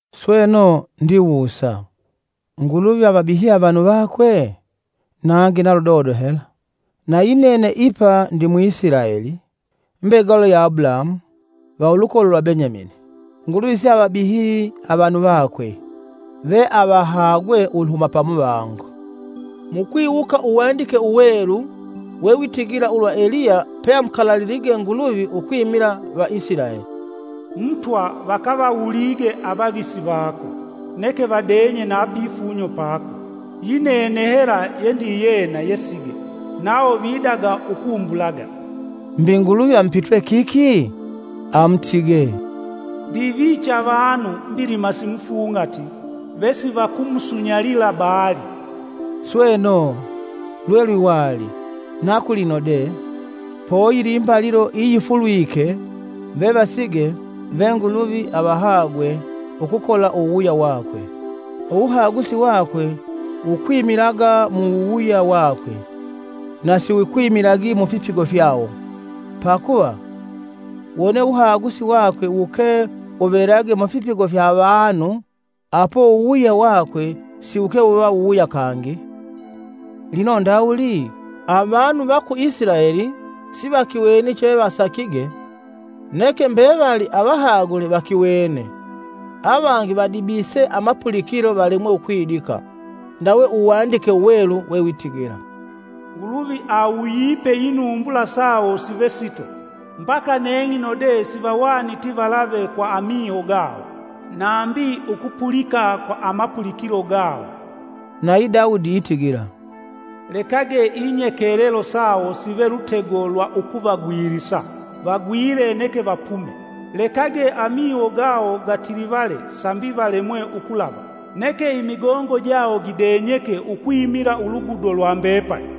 Sweno, ndiwusa: Nguluvi avabihye avanu vakwe? Nangi na ludodo hela! Na yinene ipa ndi Mwisilaeli, mbegalo ya Abulahamu, va ulukolo lwa Benyamini. Nguluvi siavabihyi avanu vakwe, veavahagwe uluhuma pamuvango. Mukwiwuka Uwandike Uwelu wewitigila ulwa Eliya peamukalalilige Nguluvi ukwimila va Isilaeli: “Mutwa vakavawulige avavisi vako neke vadenye na pifunyo pako. Yinene hela yendiyena yesige, nawo vidaga ukumbulaga.” Mbi Nguluvi amupitwe kiki? Amutige, “Ndiviche avanu mbilima simufung'ati vesivakumusunyalila Baali.” Sweno, lwe lwiwali, na kulino de; poyili imbalilo iyifulwike vevasige ve Nguluvi avahagwe ukukola wuwuya wakwe. Uwuhagusi wakwe wukwimilaga mu wuwuya wakwe na si wukwimilagi mufipigo fyawo. Pakuva, wone uwuhagusi vakwe wuke wuvelage mufipigo fya avanu apo uwuwuya wakwe siwuke wuva wuwuya kangi. Lino ndawuli? Avanu va ku Isilaeli sivakiweni chevasakige; neke mbevali avahagule vakiwene. Avangi vadibise amapulikilo valemwe ukwidika. Ndawe Uwandike Uwelu wewitigila: “Nguluvi awuyipe inumbula sawo sive sito, mbaka neng'ino de sivahwaniti valave kwa amiho gawo, nambi ukupulika kwa amapulikilo gawo.” Nayi Dawudi itigila: “Lekage inyekelelo sawo sive lutego lwa ukuvagwilisa, vagwile neke vapume. Lekage amiho gawo gatilivale sambi valemwe ukulava. Neke imigongo jawo gidenyeke ukwimila uludugo lwa mbepali!”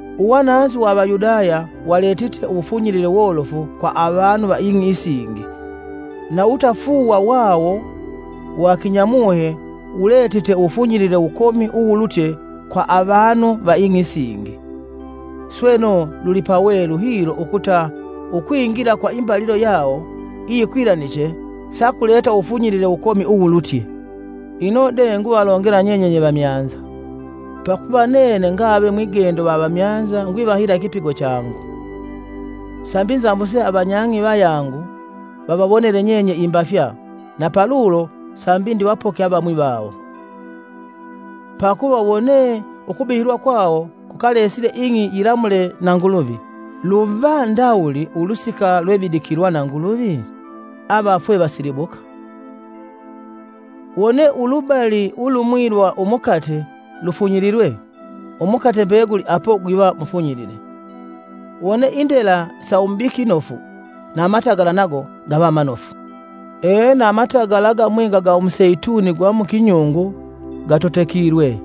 Uwananzi wa Avayudaya waletite uwufunyilile wolofu kwa avanu va ing'i isingi, na uwutafuuwa wawo wa kinyamuhe wuletite uwufunyilile wukomi uwulutye kwa avanu va ing'i isingi. Sweno lulipawelu hilo ukuta ukwingila kwa imbalilo yawo iyikwilaniche sakuleta uwufunyilile wukomi uwulutye. Ino de nguvalongela nyenye nyevamyanza: Pakuva nene ngave mwigendo wa Avamyanza ngwivahila ikipigo changu, sambi nzambuse avanyang'i vayangu vavawonele nyenye imbafya na palulo sambi ndivapoke avamwi vawo. Pakuva wone ukubihilwa kwawo kukalesile ing'i yilamule na Nguluvi, luva ndawuli ulusika lwevidikilwa na Nguluvi? Avafwe vasilibuka! Wone ulubali ulumwi lwa umukate lufunyililwe, umukate mbeguli apo gwiva mufunyilile, wone indela sa umubiki nofu, na matagala nago gava manofu. Ena amatagala agamwinga ga umuseituni gwa mukinyungu gatotekilwe,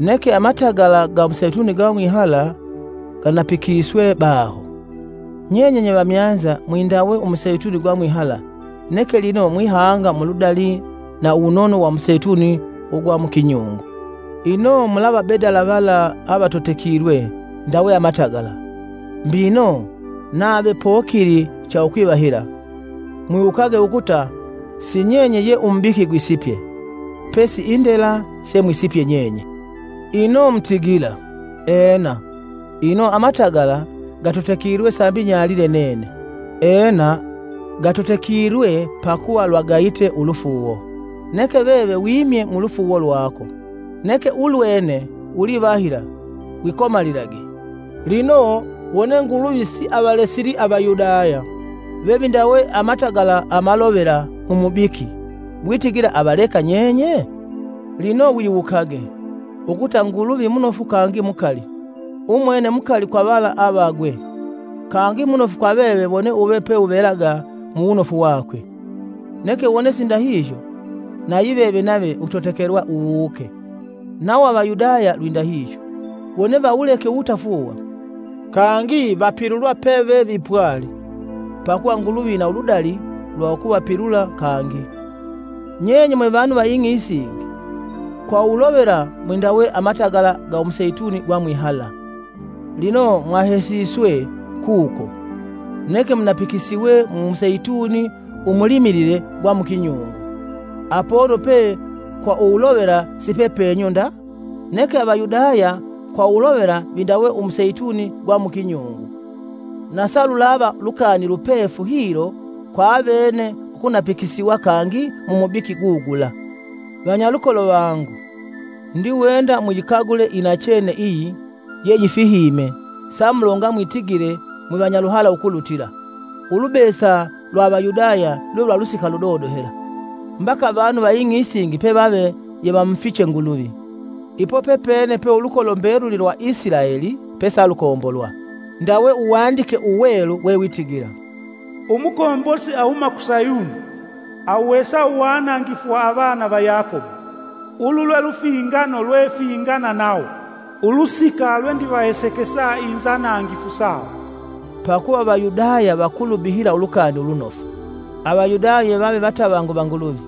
neke amatagala ga umuseituni gwa mwihala gwanapikiswe baho. Nyenye nye vamyanza mwindawe umuseituni gwa mwihala neke lino mwihanga muludali na uwunono wa umuseituni ugwa mu kinyungu. Ino mulavabedala vala avatotekilwe ndawe amatagala! Mbino nave pokili cha ukwivahila, mwiwukage ukuta si nyenye ye umubiki gwisipye, pesi indela semwisipye nyenye. Ino mutigila, “Ena, ino amatagala gatotekilwe sambi nyalile nene.” Ena gatotekilwe pakuva lwagayite ulufuuwo, neke veve wimye mu lufuuwo lwako. Neke ulwene ulivahila; wikomalilage. Lino wone Nguluvi siavalesili Avayudaya, vevindawe amatagala amalovela mumubiki, mwitigila avaleka nyenye? Lino wiwukage, ukuta Nguluvi munofu kangi mukali. Umwene mukali kwa vala avagwe, kangi munofu kwa veve wone uve peuvelaga mu wunofu wakwe; neke wone sindahihyo nayiveve nave utotekelwa uwuuke. Nawo Avayudaya lwindahihyo, wone vawuleke uwutafuuwa, kangi vapilulwa pevevipwali. Pakuva Nguluvi ina uludali lwa ukuvapilula kangi. Nyenye mwevanu va ing'i isingi, kwa uwulovela mwindawe amatagala ga umuseituni gwa mwihala, lino mwahesiswe kuko, neke munapikisiwe mu museituni umulimilile gwa mu kinyungu, apono pe kwa uwulovela sipe penyu nda. Neke Avayudaya kwa uwulovela vindawe umuseituni gwa mu kinyungu, na salulava lukani lupefu hilo kwa avene ukunapikisiwa kangi mu mubiki gugula. Vanyalukolo vangu, ndiwenda muyikagule inachene iyi yiyeyifihime samulonga mwitigile mwivanyaluhala ukulutila. Ulubesa lwa Avayudaya lwelwa lusika ludodo hela, mbaka avanu va ing'i isingi pevave yevamufiche Nguluvi. Ipo pepene pe ulukolo mbeluli Isilaeli pesalukombolwa, ndawe Uwandike Uwelu wewitigila: “Umukombosi ahuma ku Sayuni, awuhesa uwanangifu wa avana va Yakobo. Ulu lwelufingano lwefingana nawo. Ulusika lwendivahesekesa inzanangifu sawo.” Pakuva Avayudaya vakulubihila Ulukani Ulunofu, Avayudaya yevave vatavangu va Nguluvi,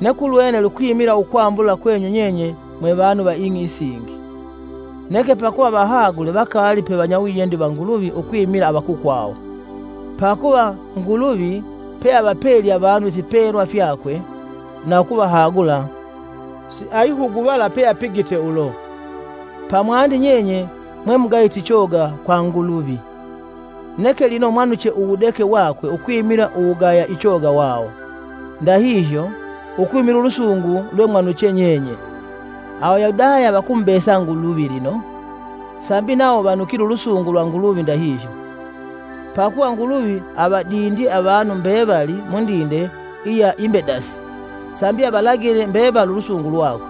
neke ulwene lukwimila ukwambula kwenyu nyenye mwe vanu va ing'i isingi. Neke pakuva vahagule vakaali pe vanyawiyendi va Nguluvi ukwimila avakukwawo. Pakuva Nguluvi peavapelye avanu ifipelwa fyakwe na ukuvahagula, siayihuguvala peapigite ulo. Pamwandi nyenye mwe mugayite ichoga kwa Nguluvi, neke lino mwanuche uwudeke wakwe ukwimila uwugaya ichoga wawo. Ndahihyo, ukwimila ulusungu lwemwanuche nyenye, Avayudaya vakumubesa Nguluvi lino, sambi nawo vanukile ulusungu lwa Nguluvi ndahihyo. Pakuva Nguluvi avadindye avanu mbevali mundinde iya imbedasi sambi avalagile mbevali ulusungu lwakwe.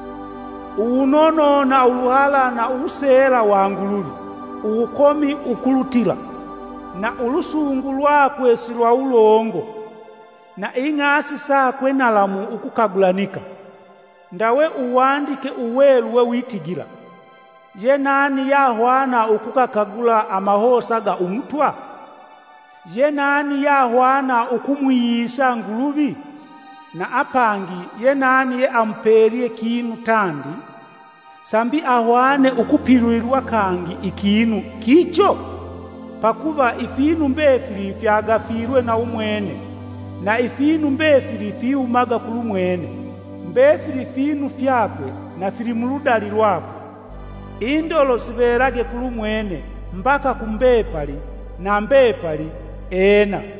Uwunono na uluhala na uwuseela wa Nguluvi uwukomi ukulutila! Na ulusungu lwakwe silwawulongo! Na ing'asi sakwe nalamu ukukagulanika! Ndawe Uwandike Uwelu wewitigila: “Yenani yahwana ukugakagula amahosa ga Umutwa? yenani yahwana ukumwiyisa Nguluvi? Na apangi yenani yeamupelye kinu tandi sambi ahwane ukupilulilwa kangi ikinu kicho?” Pakuva ifinu mbefili fyagafilwe na umwene na ifinu mbefili fihumaga kulumwene, mbefili finu fyakwe na fili muludali lwakwe. Indolo sivelage kulumwene mbaka ku mbepali na mbepali! Ena.